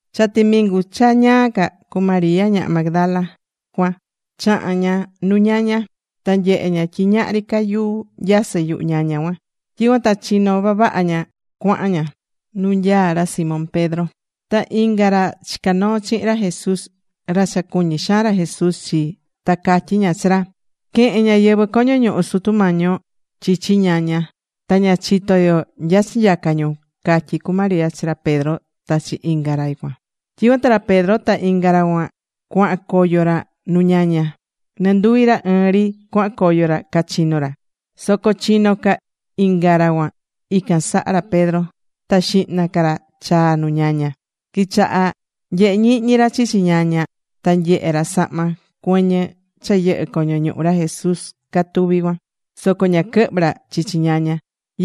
Cha timingu cha ñaa ca, cu María ñaha Magdala cuan chaha̱n ña nu ñaña. Ta nyehe̱ ña tyi ñahri ca yuu nyasɨ́ yuhu ñaña cuan. Tyicuan ta chinó vavaha ña cuahan ña nu nyaá ra Simón Pedro ta inga ra chica̱ noo chihin ra Jesús, ra cha cuñí xaan ra Jesús chi. Ta catyí ña chi ra: ―Quehe̱n ñáyɨvɨ coño ñuhu Sutu Mañi yo chichi ñaña, ta ña chitó yo nya chinyaca̱ ñu ―catyí cu María chi ra Pedro ta chi inga ra cuan. Tyicuan ta ra Pedro ta inga ra cuan cuahan coyo ra nu ñaña. Nɨnduvi ra ɨɨn ri cuahan coyo ra cachino ra. Soco chino ca inga ra cuan ican saha ra Pedro, ta xihna ca ra chaa̱ nu ñaña. Quichaha̱ nyehe ñihñi ra chichi ñaña, ta nyehe̱ ra sahma cuɨñɨ cha yɨhɨ̱ coño ñuhu ra Jesús, catuví cuan. Soco ña quɨhvɨ̱ ra chichi ñaña.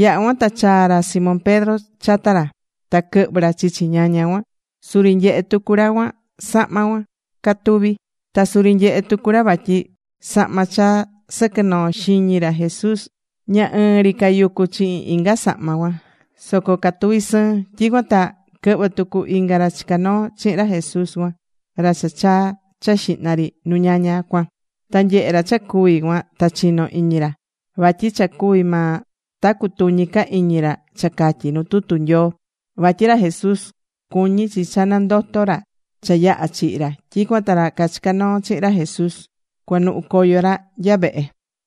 Yaha̱ cuan ta chaa̱ ra Simón Pedro chata ra, ta quɨhvɨ̱ ra chichi ñaña cuan. Suri nyehe̱ tucu ra cuan sahma cuan catuví. Ta suri nyehe̱ tucu ra vatyi sahma cha sɨquɨ̱ noo xiñi ra Jesús, ña ɨɨn ri cayucú chihin inga sahma cuan, soco catuví sɨɨn. Tyicuan ta quɨhvɨ̱ tucu inga ra chica̱ noo chihin ra Jesús cuan, ra cha chaa̱ cha xihna ri nu ñaña cuan. Ta nyehe̱ ra cha cuvi̱ cuan, ta chino̱ iñi ra. Vatyi cha cuvi̱ maa ta cutuñi ca iñi ra cha catyí nu tutu Nyoo, vatyi ra Jesús cuñí chi cha nandoto ra cha yaha̱ chihi ra. Tyicuan ta ra cachica̱ noo chihin ra Jesús cuanuhu coyo ra nya vehe.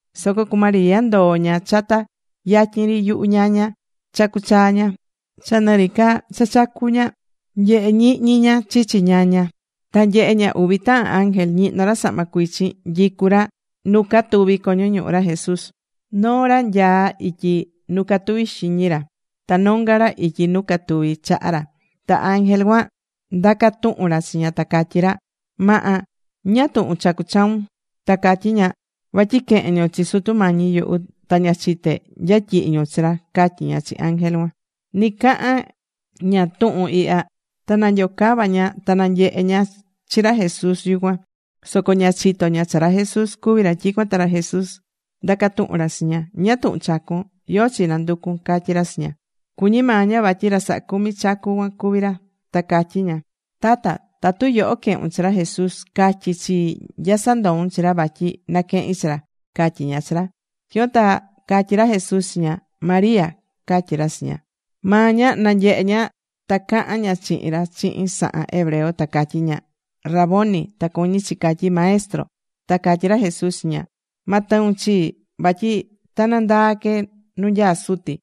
Soco cu María ndoo̱ ña chata yatyin ri yuhu ñaña, chacú chaa ña. Cha nɨri ca cha chacú ña, nyehé ñihñi ña chichi ñaña. Ta nyehe̱ ña uvi tahan ángel ñihnó ra sahma cuichin, nyicú ra nu catuvi̱ coño ñuhu ra Jesús. Noo ra nyaá ityi nu catuvi̱ xiñi ra, ta nonga ra ityi nu catuvi̱ chaha ra. Ta ángel cuan ndaca̱ tuhun ra chi ña ta catyí ra: ―Maha, ¿ñáá tuhun chacú chaun? Ta catyí ña: ―Vatyi quehe̱n ñu chi Sutu Mañi yuhu, ta ña chité nya tyihi̱ ñu chi ra ―catyí ña chi ángel cuan. Ni cahán ña tuhun ihya ta nanyocava̱ ña ta nanyehe̱ ña chi ra Jesús yucuan. Soco ña chitó ña cha ra Jesús cuví ra. Tyicuan ta ra Jesús ndaca̱ tuhun ra chi ña: ―¿Ñáá tuhun chacún? ¿Yóó chi nanducún? ―catyí ra chi ña. Cuñí maa ña vatyi ra sahá cumi chacu cuan cuví ra. Ta catyí ña: ―Tata, tatu yoho quehu̱n chi ra Jesús, ca̱tyi chii nya sandou̱n chi ra, vatyi naquehin chi ra ―catyí ña chi ra. Tyicuan ta catyí ra Jesús chi ña: ―¡María! ―catyí ra chi ña. Maa ña nanyehe̱ ña ta caha̱n ña chihin ra chihin sahan hebreo, ta catyí ña: ―¡Raboni! ―Ta cuñí chi catyí: “Maestro”. Ta catyí ra Jesús chi ña: ―Ma tɨun chii, vatyi ta nandaa que nu nyaá Suti.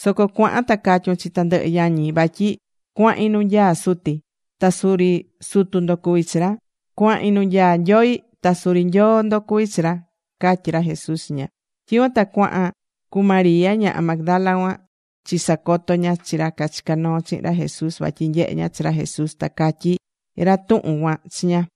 Soco cua̱han ta ca̱tyun chi tandɨhɨ yañi vatyi cuahin nu nyaá Suti, ta suri Sutu ndo cuví chi ra. Cuahin nu nyaá Nyoi, ta suri Nyoo ndo cuví chi ra ―catyí ra Jesús chi ña. Tyicuan ta chaha̱n cu María ñaha Magdala cuan chisacoto̱ ña chi ra cachica̱ noo chihin ra Jesús vatyi nyehe̱ ña chi ra Jesús ta catyi̱ ra tuhun cuan chi ña.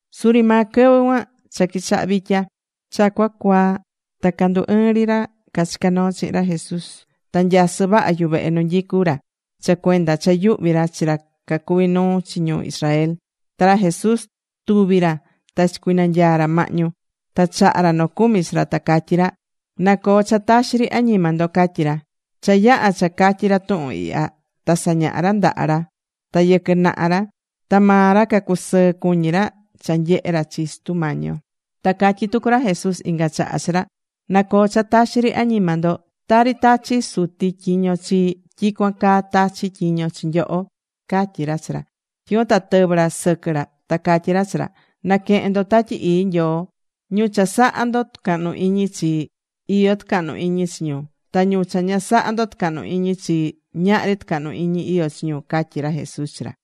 Suri maa quɨvɨ cuan cha quichaha vitya, cha cuacuaa ta candu ɨɨ̱n ri ra cachica̱ noo chihin ra Jesús. Ta nyasɨ́ vaha yuvehe nu nyicú ra cha cuenda cha yuhví ra chi ra cacuví nuu chi ñu Israel. Ta ra Jesús tuvi̱ ra ta chicuinanyaa̱ ra mahñu. Ta chaha̱ ra nocumi chi ra, ta catyí ra: ―Na coo cha taxi ri añima ndo ―catyí ra. Cha yaha̱ cha catyi̱ ra tuhun ihya ta sañaha̱ ra ndaha ra ta yɨquɨ naha ra. Ta maa ra cacusɨɨ cuñi ra cha nanyehé ra chi Sutu Mañi yo. Ta catyí tucu ra Jesús inga chaha chi ra: ―Na coo cha taxi ri añima ndo. Tari tachi̱ Suti tyiño chii, tyicuan caa tachí tyiño chi nyoho ―catyí ra chi ra. Tyicuan ta tɨvɨ̱ ra sɨquɨ ra ta catyí ra chi ra: ―Na̱quehen ndo Tatyi Ii Nyoo. Ñu cha sahá ndo tucahnu iñi chi, iyó tucahnu iñi chi ñu. Ta ñu cha ña sahá ndo tucahnu iñi chi, ñahri tucahnu iñi iyó chi ñu ―catyí ra Jesús chi ra.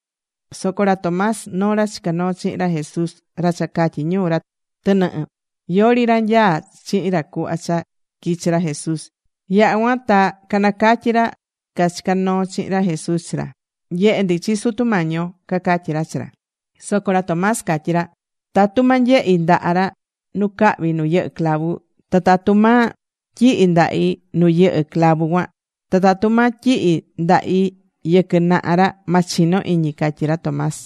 Soco ra Tomás, noo ra chica̱ noo chihin ra Jesús, ra cha catyí ñu: “ra tɨnɨhɨ”, yori ra nyaá chihin ra cuhva cha quichi̱ ra Jesús. Yaha̱ cuan ta canacatyi̱ ra cachica̱ noo chihin ra Jesús chi ra: ―Nyehe̱ ndi chi Sutu Mañi yo ―cacatyí ra chi ra. Soco ra Tomás catyí ra: ―Tatu ma nyehi ndaha ra nu cahví nu yɨhɨ̱ clavu, ta tatu ma tyihi ndahi nu yɨhɨ̱ clavu cuan, ta tatu ma tyihi ndahi yɨquɨ naha ra, ma chino iñi ―catyí ra Tomás.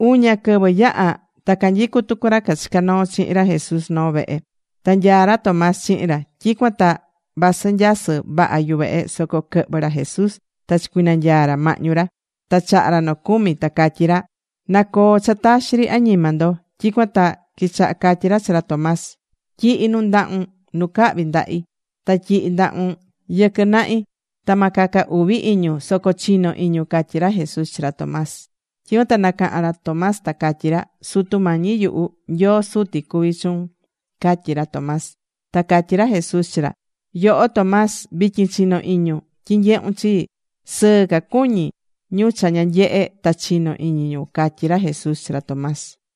Uña quɨvɨ yaha̱ ta canyicú tucu ra cachica̱ noo chihin ra Jesús noo vehe. Ta nyaá ra Tomás chihin ra. Tyicuan ta vasɨ nyasɨ́ vaha yuvehe soco quɨhvɨ̱ ra Jesús ta chicuinanyaa̱ ra mahñu ra. Ta chaha̱ ra nocumi ta catyí ra: ―Na coo cha taxi ri añima ndo. Tyicuan ta quichaha catyí ra chi ra Tomás: ―Tyi̱hi nu ndahun nu cahví ndahi. Ta tyi̱hi ndahun yɨquɨ nahi. Ta ma caca uvi iñun, soco chi̱no iñun ―catyí ra Jesús chi ra Tomás. Tyicuan ta nacaha̱n ra Tomás ta catyí ra: ―¡Sutu Mañi yuhu! ¡Nyoo Suti cuví chuun! ―catyí ra Tomás. Ta catyí ra Jesús chi ra: ―Yoho Tomás, vityin chinó iñun tyi nyehún chi. Sɨɨ ca cuñí ñu cha ña nyehe̱ ta chinó iñi ñu ―catyí ra Jesús chi ra Tomás.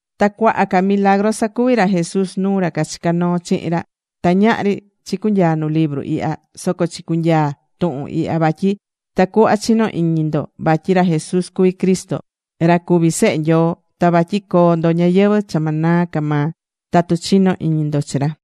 Ta cuaha ca milagru sacuvi̱ ra Jesús nuu ra cachica̱ noo chihin ra, ta ñahri chicunyaa nu libru ihya. Soco chicunyaa̱ tuhun ihya vatyi tacuhva chino iñi ndo vatyi ra Jesús cuví Cristo, ra cuví Sehe Nyoo, ta vatyi coo ndo ñayɨvɨ̱ cha ma naa ca maa tatu chinó iñi ndo chi ra.